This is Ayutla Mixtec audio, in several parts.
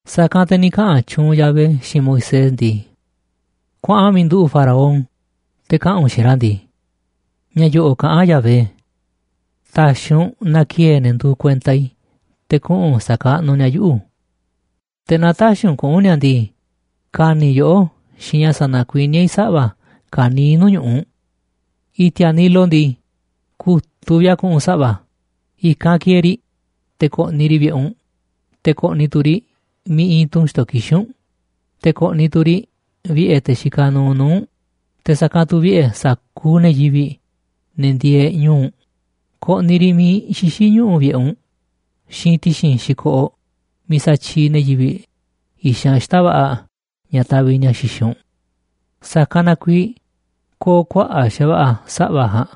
Sa̱kanꞌ te̱ ni̱ kaꞌa̱n tyuunꞌ Yahvé xiinꞌ Moisés ndii: ―Kuaꞌan miiꞌ nduꞌu̱ꞌ Faraón, te̱ kaꞌa̱n u̱nꞌ xiinꞌ ra̱ ndii: “Ña̱ yo̱ꞌo̱ꞌ kaꞌán Yahvé: Ta̱xi̱ u̱nꞌ na ki̱e̱e̱ ne̱ nduuꞌ kuenta i̱ te̱ kuꞌu̱n sa̱kaꞌnuꞌ ni̱a̱ yuꞌu̱. Te̱ naaꞌ tä̱xi̱ kuꞌu̱n ni̱a̱ ndii, ka̱ni̱ yoꞌó xiinꞌ ña̱ sa̱na̱kuiníá i̱ saꞌva̱ ka̱niiꞌ nuu̱ꞌ ñu̱ꞌuꞌ u̱nꞌ. I̱ti̱a̱ Nilo ndii, ku̱tuꞌ vi̱ꞌ a̱ ku̱ꞌu̱n saꞌva̱, i̱kanꞌ ki̱e̱e̱ riꞌ te̱ ko̱ꞌni̱ riꞌ vi̱ꞌe̱ u̱nꞌ, te̱ ko̱ꞌni̱ tu̱ riꞌ miiꞌ iinꞌ tunꞌ xto̱ kixín u̱nꞌ, te̱ ko̱ꞌni̱ tu̱ riꞌ vi̱ꞌe̱ te̱ xikaꞌ nuuꞌ nuu̱ꞌ u̱nꞌ, te̱ sa̱kanꞌ tu̱ vi̱ꞌe̱ sa̱kuuꞌ ne̱ yivi̱ꞌ, ne̱ ndieeꞌ ñu̱u̱ u̱nꞌ, ko̱ꞌni̱ riꞌ miiꞌ xixí ñuꞌu̱ vi̱ꞌe̱ u̱nꞌ xiinꞌ ti̱xi̱n xi̱koꞌoꞌ miiꞌ satyiiꞌ ne̱ yivi̱ꞌ i̱xanꞌ xita̱ꞌ va̱ꞌa̱ ña̱ taviꞌ ni̱a̱ xixiꞌ u̱nꞌ. Sa̱kanꞌ na kuiiꞌ ko̱o̱ kuaꞌa̱ꞌ xa̱va̱ꞌa̱ saꞌva̱ ja̱a̱nꞌ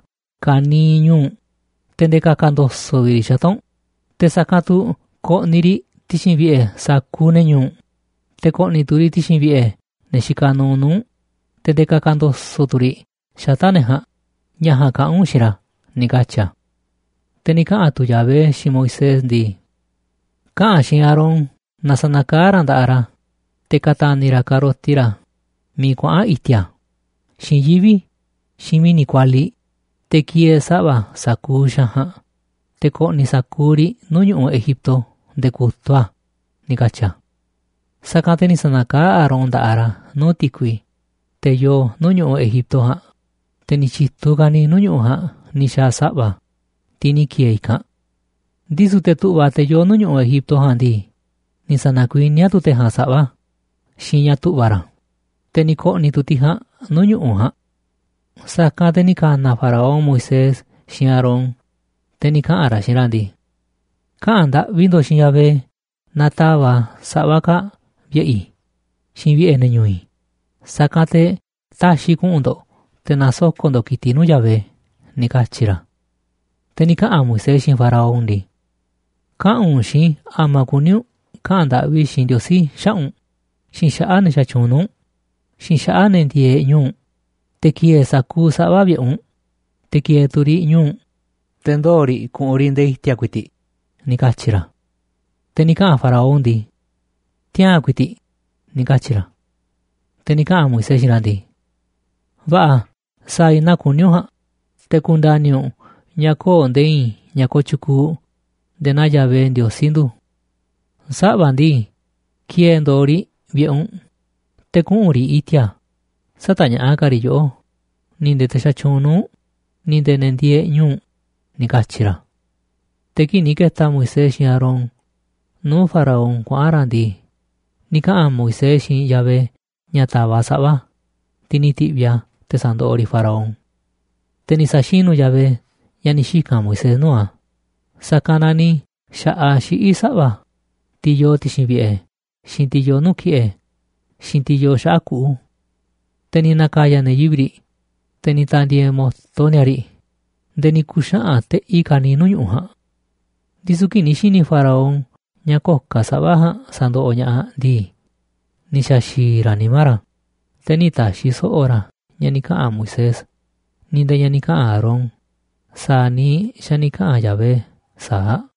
ka̱niiꞌ ñu̱u̱ u̱nꞌ, te̱ nde̱e̱ ka̱ka̱ ndo̱so̱ꞌ riꞌ xata̱ꞌ u̱nꞌ, te̱ sa̱kanꞌ tu̱ ko̱ꞌni̱ riꞌ ti̱xi̱n vi̱ꞌe̱ sa̱kuuꞌ ne̱ ñu̱u̱ u̱nꞌ, te̱ ko̱ꞌni̱ tu̱ riꞌ ti̱xi̱n vi̱ꞌe̱ ne̱ xikaꞌ nuuꞌ nuu̱ꞌ u̱nꞌ, te̱ nde̱e̱ ka̱ka̱ ndo̱so̱ꞌ tu̱ riꞌ xata̱ꞌ ne̱ ja̱a̱nꞌ”, ña̱ ja̱a̱nꞌ kaꞌa̱n u̱nꞌ xiinꞌ ra̱ ―ni̱ katyi̱ a̱. Te̱ ni̱ kaꞌa̱n tu̱ Yahvé xiinꞌ Moisés ndii: ―Kaꞌa̱n xiinꞌ Aarón na sa̱na̱kaá ra̱ nda̱ꞌaꞌ ra̱ te̱ ka̱ta̱ni̱ ra̱ ka̱roti ra̱ miiꞌ kuaꞌa̱n i̱ti̱a̱, xiinꞌ yivi̱ꞌ, xiinꞌ mi̱ni̱ kualiꞌ, te̱ ki̱e̱e̱ saꞌva̱ sa̱kuuꞌ xaanꞌ ja̱a̱nꞌ, te̱ ko̱ꞌni̱ sa̱kuuꞌ riꞌ nuu̱ꞌ ñu̱ꞌuꞌ Egipto nde̱e̱ ku̱tuꞌ a̱ ―ni̱ katyi̱ a̱. Sa̱kanꞌ te̱ ni̱ sa̱na̱kaá Aarón nda̱ꞌaꞌ ra̱ nuu̱ꞌ ti̱kui, te̱ yoo nuu̱ꞌ ñu̱ꞌuꞌ Egipto ja̱a̱nꞌ, te̱ ni̱ tyi̱tuꞌ ka̱niiꞌ nuu̱ꞌ ñu̱ꞌuꞌ ja̱a̱nꞌ ni̱ xa̱a̱ saꞌva̱, tiꞌ ni̱ ki̱e̱e̱ i̱kanꞌ. Ndisu̱ te̱ tu̱ꞌva̱, te̱ yoo nuu̱ꞌ ñu̱ꞌuꞌ Egipto ja̱a̱nꞌ ndii, ni̱ sa̱na̱kuiníá tu̱ te̱ ja̱a̱nꞌ saꞌva̱ xiinꞌ ña̱ tu̱ꞌva̱ ra̱, te̱ ni̱ ko̱ꞌni̱ tu̱ tiꞌ ja̱a̱nꞌ nuu̱ꞌ ñu̱ꞌuꞌ ja̱a̱nꞌ. Sa̱kanꞌ te̱ ni̱ ka̱na̱ Faraón Moisés xiinꞌ Aarón, te̱ ni̱ kaꞌa̱n ra̱ xiinꞌ ra̱ ndii: ―Kaꞌa̱n ndaꞌvi ndo̱ꞌ xiinꞌ Yahvé na ta̱va̱ꞌ a̱ saꞌva̱ kaa̱ꞌ vi̱ꞌe̱ i̱ xiinꞌ vi̱ꞌe̱ ne̱ ñu̱u̱ i̱, sa̱kanꞌ te̱ ta̱xi̱ i̱ kuꞌu̱n ndo̱ꞌ te̱ na̱soko̱ꞌ ndo̱ꞌ ki̱tiꞌ nuu̱ꞌ Yahvé ―ni̱ katyi̱ ra̱. Te̱ ni̱ kaꞌa̱n Moisés xiinꞌ Faraón ndii: ―Kaꞌa̱n u̱nꞌ xiinꞌ i̱ a̱ma̱ kuní u̱nꞌ kaꞌa̱n ndaꞌvi i̱ xiinꞌ Ndiosí xaꞌa̱ꞌ u̱nꞌ xiinꞌ xaꞌa̱ꞌ te̱ xatyuunꞌ nuu̱ꞌ u̱nꞌ xiinꞌ xaꞌa̱ꞌ ne̱ ndieeꞌ ñu̱u̱ u̱nꞌ, te̱ ki̱e̱e̱ sa̱kuuꞌ saꞌva̱ vi̱ꞌe̱ u̱nꞌ, te̱ ki̱e̱e̱ tu̱ riꞌ ñu̱u̱ u̱nꞌ, te̱ ndoo̱ riꞌ ku̱ꞌu̱n riꞌ nde̱e̱ i̱ti̱a̱ ku̱i̱ti̱ꞌ ―ni̱ katyi̱ ra̱. Te̱ ni̱ kaꞌa̱n Faraón ndii: ―Tiaa̱n ku̱i̱ti̱ꞌ ―ni̱ katyi̱ ra̱. Te̱ ni̱ kaꞌa̱n Moisés xiinꞌ ra̱ ndii: ―Va̱ꞌa̱, sa̱a̱ i̱ naa kuní u̱nꞌ ja̱a̱nꞌ, te̱ ku̱nda̱ni̱ u̱nꞌ ña̱ köo̱ꞌ nde̱e̱ i̱i̱n ña̱ kooꞌ tyukuuꞌ nde̱e̱ naa Yahvé, Ndiosí ndu̱. Saꞌva̱ ndii, ki̱e̱e̱ ndo̱o̱ riꞌ vi̱ꞌe̱ u̱nꞌ, te̱ kuꞌu̱n riꞌ i̱ti̱a̱. Sä̱ta̱ñaꞌa̱ꞌ ka̱ riꞌ yoꞌó, ni̱ nde̱e̱ te̱ xatyuunꞌ nuu̱ꞌ u̱nꞌ, ni̱ nde̱e̱ ne̱ ndieeꞌ ñu̱u̱ u̱nꞌ ―ni̱ katyi̱ ra̱. Te̱ kii̱ꞌ ni̱ ke̱ta̱ Moisés xiinꞌ Aarón nuu̱ꞌ Faraón kuaꞌa̱n ra̱ ndii, ni̱ kaꞌa̱n Moisés xiinꞌ Yahvé ña̱ ta̱va̱ꞌ a̱ saꞌva̱, tiꞌ ni̱ ti̱ꞌviꞌ a̱ te̱ sa̱ndoꞌoꞌ riꞌ Faraón. Te̱ ni̱ sa̱xinu̱ Yahvé ña̱ ni̱ xika̱n Moisés nuu̱ꞌ a̱, sa̱kanꞌ na ni̱ xa̱ꞌaꞌ xiꞌí saꞌva̱, tiꞌ yoo ti̱xi̱n vi̱ꞌe̱, xiinꞌ tiꞌ yoo nuu̱ꞌ ki̱ꞌe̱, xiinꞌ tiꞌ yoo xaꞌa̱ꞌ kuꞌu̱. Te̱ ni̱ na̱ka̱ya̱ ne̱ yivi̱ꞌ riꞌ, te̱ ni̱ ta̱ndi̱e̱e̱ mu̱to ni̱a̱ riꞌ nde̱e̱ ni̱ ku̱xaꞌa̱n teꞌi ka̱niiꞌ nuu̱ꞌ ñu̱ꞌuꞌ ja̱a̱nꞌ. Ndisu̱ kii̱ꞌ ni̱ xi̱ni̱ Faraón ña̱ köo̱ꞌ ka̱ saꞌva̱ ja̱a̱nꞌ sa̱ndoꞌoꞌ ña̱ꞌaꞌ ndii, ni̱ xa̱xi̱i̱ ra̱ nimá ra̱, te̱ nï̱ ta̱xi̱ so̱ꞌo̱ ra̱ ña̱ ni̱ kaꞌa̱n Moisés, ni̱ nde̱e̱ ña̱ ni̱ kaꞌa̱n Aarón sa̱a̱ niiꞌ xa̱ ni̱ kaꞌa̱n Yahvé sa̱aꞌ.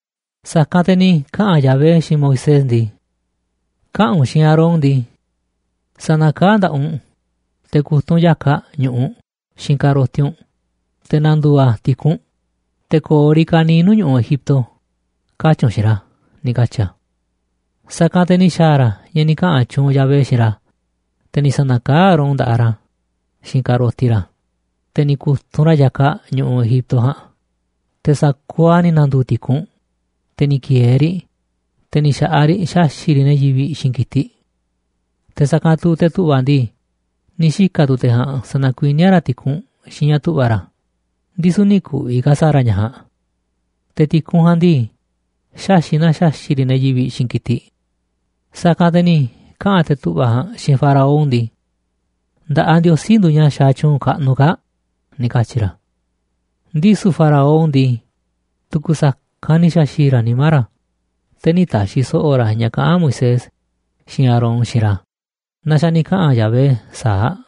Sa̱kanꞌ te̱ ni̱ kaꞌa̱n Yahvé xiinꞌ Moisés ndii: ―Kaꞌa̱n u̱nꞌ xiinꞌ Aarón ndii: “Sa̱na̱kaá nda̱ꞌaꞌ u̱nꞌ te̱ ku̱tunꞌ u̱nꞌ ya̱kaꞌ ñu̱ꞌuꞌ xiinꞌ ka̱roti u̱nꞌ, te̱ na̱ndu̱u̱ a̱ ti̱kunꞌ, te̱ ko̱o̱ riꞌ ka̱niiꞌ nuu̱ꞌ ñu̱ꞌuꞌ Egipto”, katyi̱ u̱nꞌ xiinꞌ ra̱ ―ni̱ katyi̱ a̱. Sa̱kanꞌ te̱ ni̱ xa̱a̱ ra̱ ña̱ ni̱ kaꞌa̱n tyuunꞌ Yahvé xiinꞌ ra̱, te̱ ni̱ sa̱na̱kaá Aarón nda̱ꞌaꞌ ra̱ xiinꞌ ka̱roti ra̱, te̱ ni̱ ku̱tunꞌ ra̱ ya̱kaꞌ ñu̱ꞌuꞌ Egipto ja̱a̱nꞌ, te̱ sa̱kuuꞌ a̱ ni̱ na̱ndu̱u̱ ti̱kunꞌ, te̱ ni̱ ki̱e̱e̱ riꞌ, te̱ ni̱ xa̱ꞌaꞌ riꞌ xaxi̱ꞌ riꞌ ne̱ yivi̱ꞌ xiinꞌ ki̱tiꞌ. Te̱ sa̱kanꞌ tu̱ te̱ tu̱ꞌva̱ ndii, ni̱ xika̱ tu̱ te̱ ja̱a̱nꞌ sa̱na̱kuiníá ra̱ ti̱kunꞌ xiinꞌ ña̱ tu̱ꞌva̱ ra̱, ndisu̱ nï̱ ku̱vi̱ ka̱ sa̱a̱ ra̱ ña̱ ja̱a̱nꞌ. Te̱ ti̱kunꞌ ja̱a̱nꞌ ndii, xaxi̱ꞌ na xaxi̱ꞌ riꞌ ne̱ yivi̱ꞌ xiinꞌ ki̱tiꞌ. Sa̱kanꞌ te̱ ni̱ kaꞌa̱n te̱ tu̱ꞌva̱ ja̱a̱nꞌ xiinꞌ Faraón ndii: ―Nda̱ꞌaꞌ Ndiosí nduuꞌ ña̱ xaaꞌ tyuunꞌ kaꞌnuꞌ kaa̱ꞌ ―ni̱ katyi̱ ra̱. Ndisu̱ faraón ndii, tu̱ku̱ sa̱kanꞌ ni̱ xa̱xi̱i̱ ra̱ nimá ra̱, te̱ nï̱ ta̱xi̱ so̱ꞌo̱ ra̱ ña̱ kaꞌán Moisés xiinꞌ Aarón xiinꞌ ra̱ naa xa̱ ni̱ kaꞌa̱n Yahvé sa̱aꞌ.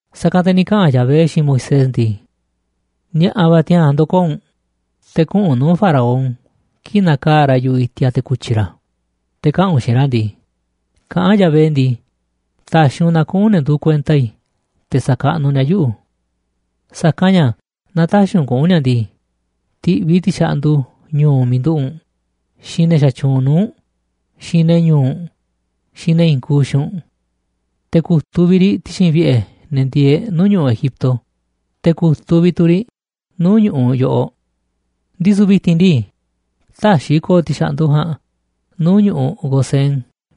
Sa̱kanꞌ te̱ ni̱ kaꞌa̱n Yahvé xiinꞌ Moisés ndii: ―Ni̱a̱ꞌa̱ va̱ tiaa̱n ndo̱koo̱ u̱nꞌ, te̱ kuꞌu̱n u̱nꞌ nuu̱ꞌ Faraón kii̱ꞌ na̱kaa̱ꞌ ra̱ yu̱ꞌuꞌ i̱ti̱a̱ te̱ ku̱tyi̱ ra̱, te̱ kaꞌa̱n u̱nꞌ xiinꞌ ra̱ ndii: “Kaꞌán Yahvé ndii, ta̱xi̱ u̱nꞌ na kuꞌu̱n ne̱ nduuꞌ kuenta i̱ te̱ sa̱kaꞌnuꞌ ni̱a̱ yuꞌu̱. Sa̱kanꞌ ña̱ naaꞌ tä̱xi̱ u̱nꞌ kuꞌu̱n ni̱a̱ ndii, ti̱ꞌviꞌ i̱ ti̱xa̱ꞌndu ñu̱u̱ miiꞌ nduꞌu̱ꞌ u̱nꞌ, xiinꞌ ne̱ xatyuunꞌ nuu̱ꞌ u̱nꞌ, xiinꞌ ne̱ ñu̱u̱ u̱nꞌ, xiinꞌ ne̱ i̱i̱n kuuꞌ xiinꞌ u̱nꞌ. Te̱ ku̱tuꞌ vi̱ꞌ riꞌ ti̱xi̱n vi̱ꞌe̱ ne̱ ndieeꞌ nuu̱ꞌ ñu̱ꞌuꞌ Egipto, te̱ ku̱tuꞌ vi̱ꞌ tu̱ riꞌ nuu̱ꞌ ñu̱ꞌuꞌ yoꞌoꞌ. Ndisu̱ vi̱ti̱n ndii, tä̱xi̱ i̱ ko̱o̱ ti̱xa̱ꞌndu ja̱a̱nꞌ nuu̱ꞌ ñu̱ꞌuꞌ Gosén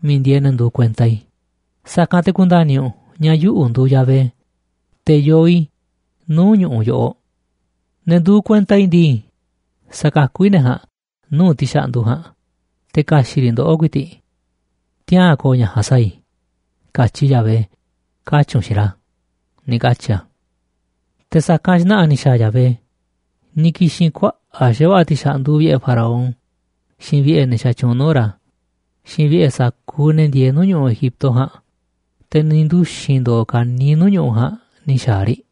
miiꞌ ndieeꞌ ne̱ nduuꞌ kuenta i̱, sa̱kanꞌ te̱ ku̱nda̱ni̱ u̱nꞌ ña̱ yuꞌu̱ nduuꞌ Yahvé, te̱ yoo i̱ nuu̱ꞌ ñu̱ꞌuꞌ yoꞌoꞌ. Ne̱ nduuꞌ kuenta i̱ ndii, sa̱kakú i̱ ne̱ ja̱a̱nꞌ nuu̱ꞌ ti̱xa̱ꞌndu ja̱a̱nꞌ, te̱ ka̱xi̱ꞌ riꞌ ndoꞌó ku̱i̱ti̱ꞌ. Tiaa̱n ko̱o̱ ña̱ ja̱a̱nꞌ sa̱a̱ i̱, katyi Yahvé”, katyi̱ u̱nꞌ xiinꞌ ra̱ ―ni̱ katyi̱ a̱. Te̱ sa̱kanꞌ xna̱ꞌa̱ ni̱ xa̱a̱ Yahvé, ni̱ ki̱xi̱n kuaꞌa̱ꞌ xa̱va̱ꞌa̱ ti̱xa̱ꞌndu vi̱ꞌe̱ Faraón, xiinꞌ vi̱ꞌe̱ ne̱ xatyuunꞌ nuu̱ꞌ ra̱, xiinꞌ vi̱ꞌe̱ sa̱kuuꞌ ne̱ ndieeꞌ nuu̱ꞌ ñu̱ꞌuꞌ Egipto ja̱a̱nꞌ, te̱ ni̱ nduxi̱n ndo̱o̱ ka̱niiꞌ nuu̱ꞌ ñu̱ꞌuꞌ ja̱a̱nꞌ ni̱ xa̱a̱ riꞌ.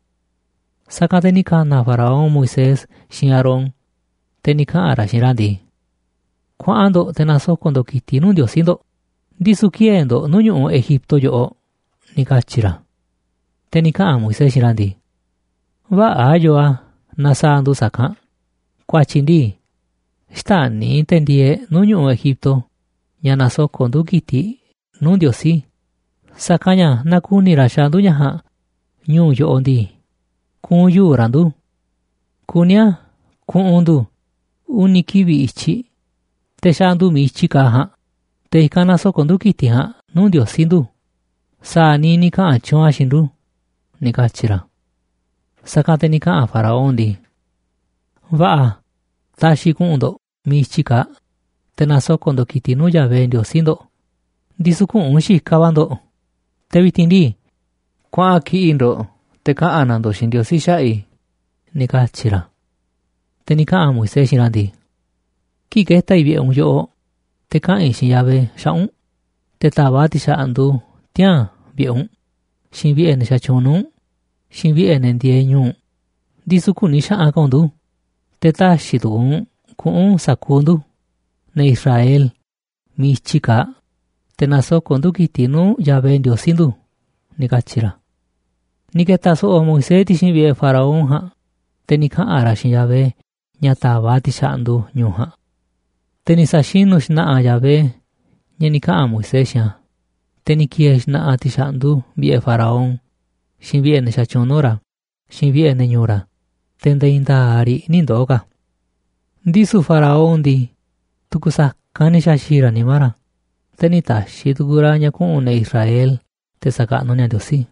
Sa̱kanꞌ te̱ ni̱ ka̱na̱ Faraón Moisés xiinꞌ Aarón, te̱ ni̱ kaꞌa̱n ra̱ xiinꞌ ra̱ ndii: ―Kuaꞌan ndo̱ꞌ te̱ na̱soko̱ꞌ ndo̱ꞌ ki̱tiꞌ nuu̱ꞌ Ndiosí ndo̱ꞌ, ndisu̱ kï̱e̱e̱ ndo̱ꞌ nuu̱ꞌ ñu̱ꞌuꞌ Egipto yoꞌoꞌ ―ni̱ katyi̱ ra̱. Te̱ ni̱ kaꞌa̱n Moisés xiinꞌ ra̱ ndii: ―Vä̱ꞌa̱ yoo a̱ naaꞌ sa̱a̱ ndu̱ sa̱kanꞌ, ku̱a̱tyi̱ ndii, xtäni̱ te̱ ndieeꞌ nuu̱ꞌ ñu̱ꞌuꞌ Egipto ña̱ nasoko̱ꞌ ndu̱ ki̱tiꞌ nuu̱ꞌ Ndiosí, sa̱kanꞌ ña̱ naaꞌ ku̱ni̱ ra̱ xaaꞌ ndu̱ ña̱ ja̱a̱nꞌ ñu̱u̱ yoꞌoꞌ ndii, ku̱u̱n yuu̱ꞌ ra̱ ndu̱. Kuní a̱ ku̱ꞌu̱n ndu̱ uni̱ kivi̱ꞌ i̱tyiꞌ te̱ xaa̱ ndu̱ miiꞌ i̱tyi kaaꞌ ja̱a̱nꞌ, te̱ i̱kanꞌ na̱soko̱ꞌ ndu̱ ki̱tiꞌ ja̱a̱nꞌ nuu̱ꞌ Ndiosí ndu̱ sa̱a̱ niiꞌ ni̱ kaꞌa̱n tyuunꞌ a̱ xiinꞌ ndu̱ ―ni̱ katyi̱ ra̱. Sa̱kanꞌ te̱ ni̱ kaꞌa̱n Faraón ndii: ―Va̱ꞌa̱, ta̱xi̱ i̱ kuꞌu̱n ndo̱ꞌ miiꞌ i̱tyi kaaꞌ, te̱ na̱soko̱ꞌ ndo̱ꞌ ki̱tiꞌ nuu̱ꞌ Yahvé Ndiosí ndo̱ꞌ, ndisu̱ küꞌu̱n xikaꞌ va̱ ndo̱ꞌ. Te̱ vi̱ti̱n ndii, kuaꞌan kiꞌi̱ꞌ ndo̱ꞌ te̱ kaꞌa̱n na̱ ndo̱ꞌ xiinꞌ Ndiosí xaꞌa̱ꞌ i̱ ―ni̱ katyi̱ ra̱. Te̱ ni̱ kaꞌa̱n Moisés xiinꞌ ra̱ ndii: ―Kii̱ꞌ ke̱ta̱ i̱ vi̱ꞌe̱ u̱nꞌ yoꞌoꞌ te̱ kaꞌa̱n i̱ xiinꞌ Yahvé xaꞌa̱ꞌ u̱nꞌ te̱ ta̱va̱ꞌ a̱ ti̱xa̱ꞌndu tiaa̱n vi̱ꞌe̱ u̱nꞌ, xiinꞌ vi̱ꞌe̱ ne̱ xatyuunꞌ nuu̱ꞌ u̱nꞌ, xiinꞌ vi̱ꞌe̱ ne̱ ndieeꞌ ñu̱u̱ u̱nꞌ, ndisu̱ kü̱ni̱ xaꞌanꞌ ka̱ u̱nꞌ ndu̱, te̱ tä̱xi̱ tu̱ku̱u̱ u̱nꞌ kuꞌu̱n sa̱kuuꞌ ndu̱, ne̱ Israel, miiꞌ i̱tyi kaaꞌ, te̱ na̱soko̱ꞌ ndu̱ ki̱tiꞌ nuu̱ꞌ Yahvé Ndiosí ndu̱ ―ni̱ katyi̱ ra̱. Ni̱ ke̱ta̱ so̱ꞌo̱ Moisés ti̱xi̱n vi̱ꞌe̱ Faraón ja̱a̱nꞌ, te̱ ni̱ kaꞌa̱n ra̱ xiinꞌ Yahvé ña̱ ta̱va̱ꞌ a̱ ti̱xa̱ꞌndu ñu̱u̱ ja̱a̱nꞌ. Te̱ ni̱ sa̱xinu̱ xna̱ꞌa̱ Yahvé ña̱ ni̱ kaꞌa̱n Moisés xiinꞌ a̱, te̱ ni̱ ki̱e̱e̱ xna̱ꞌa̱ ti̱xa̱ꞌndu vi̱ꞌe̱ Faraón, xiinꞌ vi̱ꞌe̱ ne̱ xatyuunꞌ nuu̱ꞌ ra̱, xiinꞌ vi̱ꞌe̱ ne̱ ñu̱u̱ ra̱, te̱ nde̱e̱ i̱i̱n nda̱a̱ꞌ riꞌ nï̱ ndoo̱ ka̱. Ndisu̱ Faraón ndii, tu̱ku̱ sa̱kanꞌ ni̱ xa̱xi̱i̱ ra̱ nimá ra̱, te̱ nï̱ ta̱xi̱ tu̱ku̱u̱ ra̱ ña̱ kuꞌu̱n ne̱ Israel te̱ sa̱kaꞌnuꞌ ni̱a̱ Ndiosí.